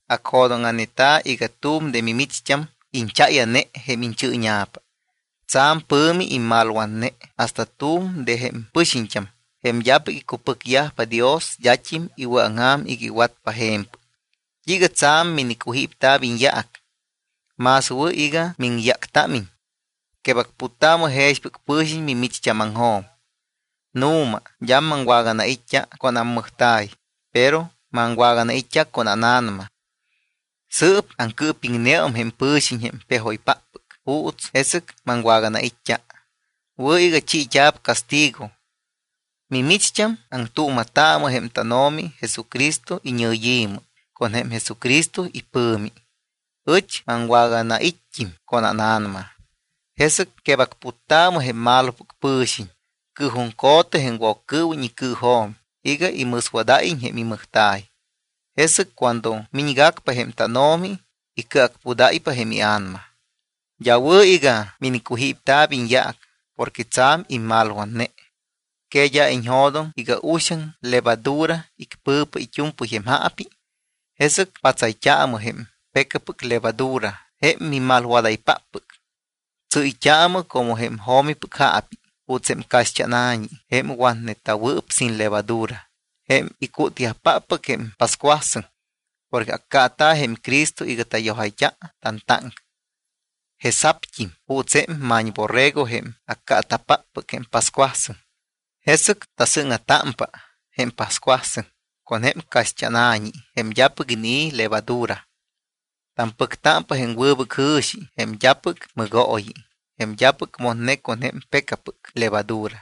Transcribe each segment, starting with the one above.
Anjo̱dóŋa̱neta iga tu̱m de micht́ampɨc ichaya̱ne jém ichɨ́ña̱pa. Tsa̱m pɨ̱mi imalwatne hasta tu̱m de jém pɨxiñt́am, jém d́apɨc icupɨcyajpa Dios, d́at́im iwɨ̱aŋja̱m iga iwatpa je̱mpɨc. ¿T́iiga tsa̱m minicujípta̱p iñyaac? Más wɨ̱ iga miŋyáctámiñ. Quebacputtaamɨ jexpɨc pɨ̱xiñ mimicht́ámaŋjo̱m. Nu̱ma, d́a maŋwaganait́t́a con ammɨjta̱y, pero maŋwaganait́t́a con ána̱nama. Sɨɨp aŋcɨɨpiŋneum jém pɨ̱xiñ jém pejoypáppɨc juuts jesɨc maŋwaganait́t́a. Wɨ̱ iga chiit́a̱p castigo. Mimicht́am aŋtuuma̱taamɨ jém tánO̱mi Jesucristo iñɨyi̱mɨ con jém Jesucristo ipɨ̱mi. Ɨch maŋwaganait́t́im con ána̱nama. Jesɨc quebacputtaamɨ jém malopɨc pɨ̱xiñ. Cɨɨjuŋco̱tɨ jém Woccɨɨwiñ icɨɨjo̱m iga imɨswadáyiñ jém imɨjta̱y. Jesɨc cuando miñgacpa jém tánO̱mi, icɨacpudáypa jém ia̱nama. D́a wɨ̱ iga minicujípta̱p iñyaac porque tsa̱m immalwatne. ¿Que d́a iñjo̱doŋ iga uxaŋ levadura icpɨ̱pa it́u̱mpɨy jém jaapi? Jesɨc patsayt́aamɨ jém pecapɨc levadura jém mimalwadaypáppɨc, tsɨ́yt́aamɨ como jém jo̱mipɨc jaapi, juuts jém caxt́ána̱ñi jém watnewɨɨp sin levadura, jém icútyajpáppɨc jém pascuasɨŋ. Porque accaata̱ jém Cristo iga tayojayt́a tantáŋca, jesa̱pt́im juuts jém ma̱ñborrego jém accaata̱páppɨc jém pascuasɨŋ. Jesɨc tasɨ́ŋa̱támpa jém pascuasɨŋ con jém caxt́ána̱ñi jém d́apɨc inii̱ levadura. Tampɨctámpa jém wɨbɨc jɨ̱xi, jém d́apɨc mɨgooyi, jém d́apɨc motne con jém pecapɨc levadura.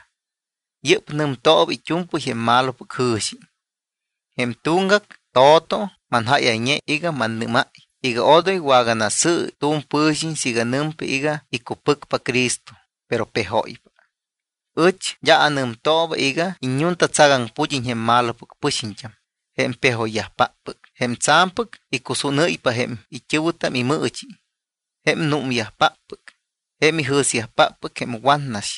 Yɨ́p nɨmtooba it́u̱mpɨy jém malopɨc jɨ̱xi. Jém tuŋgac to̱to manjáyayñe iga mannɨ́máy iga odoy waganasɨ̱ɨ tu̱m pɨ̱xiñ siiga nɨmpa iga icupɨcpa Cristo, pero pejóypa. Ɨch d́a anɨmtooba iga iññuntatsagaŋpu̱d́iñ jém malopɨc pɨxiñt́am, jém pejoyyajpáppɨc, jém tsa̱mpɨc icusúnɨyyajpa jém it́ɨ̱wɨtam imɨɨchi, jém númyajpáppɨc, jém ijɨ̱syajpáppɨc jém watnas,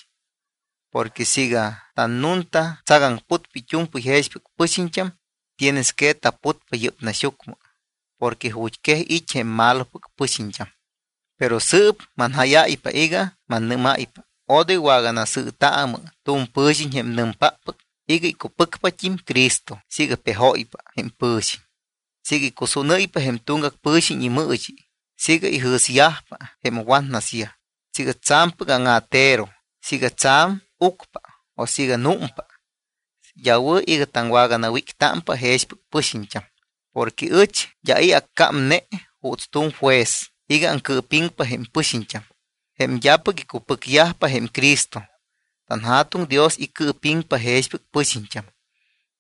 porque siiga tannuntatsagaŋputpa it́u̱mpɨy jexpɨc pɨxiñt́am, tienes que taputpa yɨ́p naxyucmɨ porque ju̱t́quej it́ jém malopɨc pɨxiñt́am. Pero sɨɨp manjáyáypa iga mannɨ́máypa, odoy waganasɨɨtaamɨ tu̱m pɨ̱xiñ jém nɨmpáppɨc iga icupɨcpat́im Cristo siiga pejóypa jém pɨ̱xiñ, siiga icusúnɨ́ypa jém tuŋgac pɨ̱xiñ imɨɨchi, siiga ijɨ̱syajpa jém watnasyaj, siiga tsa̱mpɨc áŋa̱tero, siiga tsa̱m ucpa o siiga númpa. D́a wɨ̱ iga taŋwaganawíctámpa jexpɨc pɨxiñt́am. Porque ɨch d́a i̱ accámne juuts tu̱m juez iga aŋcɨɨpiŋpa jém pɨxiñt́am jém d́apɨc icupɨcyajpa jém Cristo. TanJa̱tuŋ Dios icɨɨpiŋpa jexpɨc pɨxiñt́am.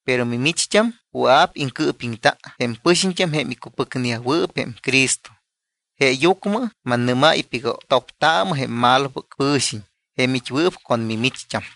Pero mimicht́am wɨa̱p iŋcɨɨpiŋta jém pɨxiñt́am jém icupɨcneyajwɨɨp jém Cristo. Jeeyucmɨ mannɨ́máypa iga toptaamɨ jém malopɨc pɨ̱xiñ jém it́wɨɨp con mimicht́am.